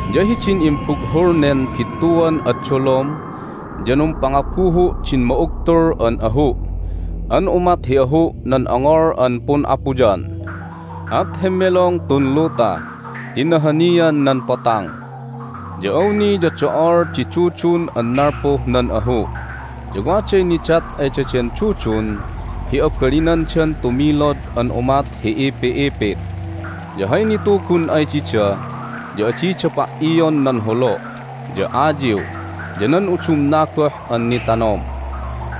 Ya hidin imbughul nen bittuan ad dolom ya numpangabuhu' din ma'ugtul an ahu' an umat hi ahu' nan ongol an pun'apuyan. At hemmelong tun luta ti nahanian nan potang. Ya awni ya do'ol di dudun an nalpuh nan ahu'. Ya waday nidat ay daden dudun hi abalinandan tumilod an umat hi ipi'ipit. Ya hay nitugun ay dida ya adida pa"ion nan holo', ya ayiw, ya nan udumna goh an nitanom,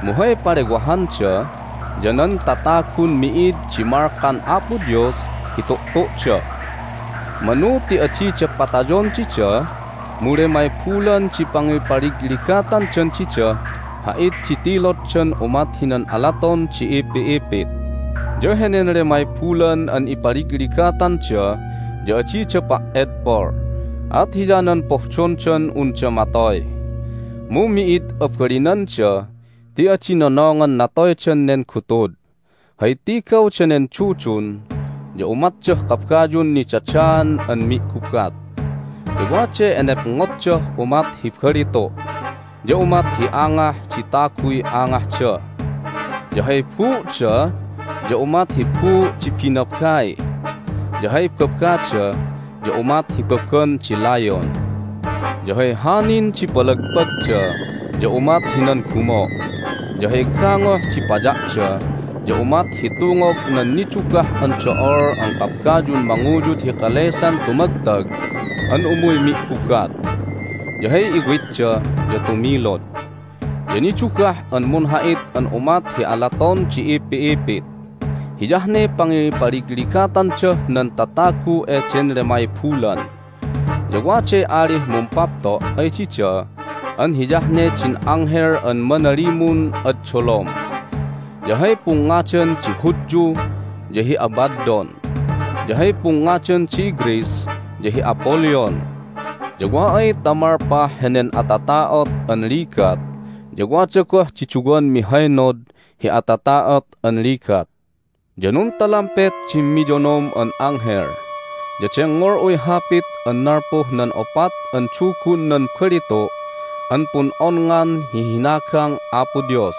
mu hay palewahanda ya nan tatagun mi'id di malkan Apo Dios hi tu'tu'da. Manu ti adida patayon dida, mu lemay bulan di pangipaligligatandan didah ha'it di tiloddan umat hinan alaton di ipi'ipit. Ya henen lemay bulan an ipaligligatanda ya adida pa"edpol, at hiyanan pohdondan unda matoy, mu mi'id abalinanda ti adi nonongan natoydan nen gutud. Hay tigaw danen dudun ya umatdah kabayun nidadaan an mi'gubat. Ya waday enepngotdah umat hi balitu', ya umat hi angah di taguy angahda. Ya hay buu'da ya umat hi buu' di binabai, ya hay babada ya umat hi baban di layon. Ya hay hanin di palagpagda ya umat hinan gumo'. Ya hay gangoh di paya'da ya umat hi tungog nan nidugah an do'ol an kabayun manguyud hi kalesan tumagtag an umuy mi'gubat. Ya hay iwitda ya tumilod, ya nidugah an munha'it an umat hi alaton di ipi'ipit. Hiyah ne pangipaligligatandah nan tatagu eden lemay bulan. Ya waday alih mumpapto' ay dida an hiyah ne din anghel an manalimun ad dolom. Ya hay pungngadan di Hudyu ya hi Abaddon, ya hay pungngadan di iGreece ya hi Apollyon. Ya wa ay ta malpah henen atata'ot an ligat ya wada goh di duwan mihaynod hi atata'ot an ligat. Ya nuntalampet din miyonom an anghel. Ya dengngol'uy hapit an nalpuh nan opat an dugun nan balitu' an pun'onngan hi hinagang Apo Dios.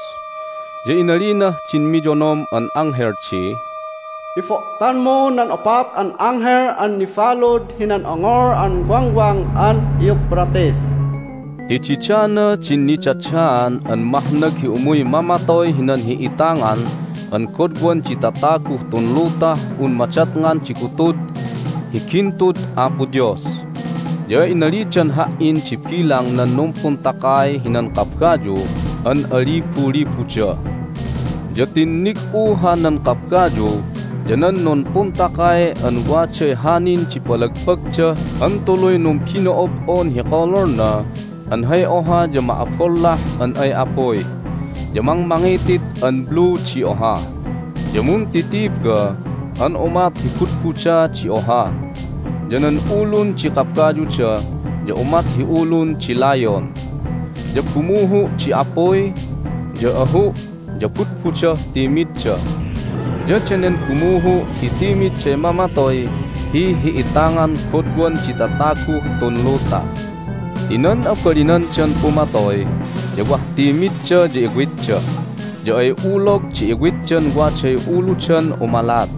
Ya inalinah din miyonom an anghel di, "Ibo'tanmu nan opat an anghel an nibalud hinan ongol an Wangwang an Euphrates!" Ti didana din nidadaan an mahnag hi umuy mamatoy hinan hi'itangan an godwan di tataguh tun lutah un madatngan di gutud hi gintud Apo Dios. Ya inalidan ha"in di bilang nan numpuntakay hinan kabayu an alibulibuda. Ya tinnig'u hanan kabayu ya nan numpuntakay an waday hanin di palagpagda an tuluy numbino'ob'on hi kololna an hay oha ya ma'abollah an ay apuy, ya mangmangitit an blue di oha, ya muntitiba an umat hi budbuda di oha. Ya nan ulun di kabayuda ya umat hi ulun di layon. Ya bumuhu' di apuy, ya ahu', ya budbudah timidda. Ya danen bumuhu' hi timidday mamatoy hi hi'itangan godwan di tataguh tun luta. Ti nan abalinandan pumatoy ya wah timmidda ya iwitda. Ya ay ulog di iwitdan waday uludan umalat.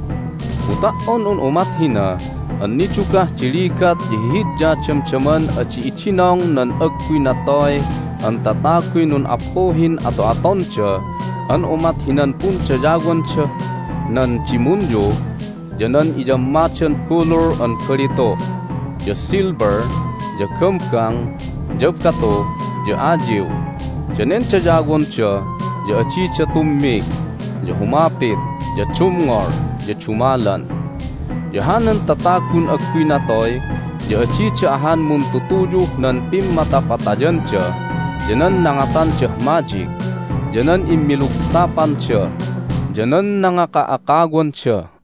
Mu ta"on un umat hina an nidugah di ligat ya hihidya damdaman adi idinong nan agguy natoy an tataguy nun'appuhin ato'atonda an umat hinan pundayawandah nan dimunyu ya nan inyammadan bulul an balitu', ya silver, ya gambang, ya batu, ya ayiw. Danen dayawonda ya adida tummig, ya humapit, ya dumngol, ya dumalan. Ya hanan tatagun agguy natoy ya adida ahan muntutuyuh nan pimmatapatayanda, ya nan nangatandah madyik, ya nan immilugtapanda, ya nan nangaka'akawanda.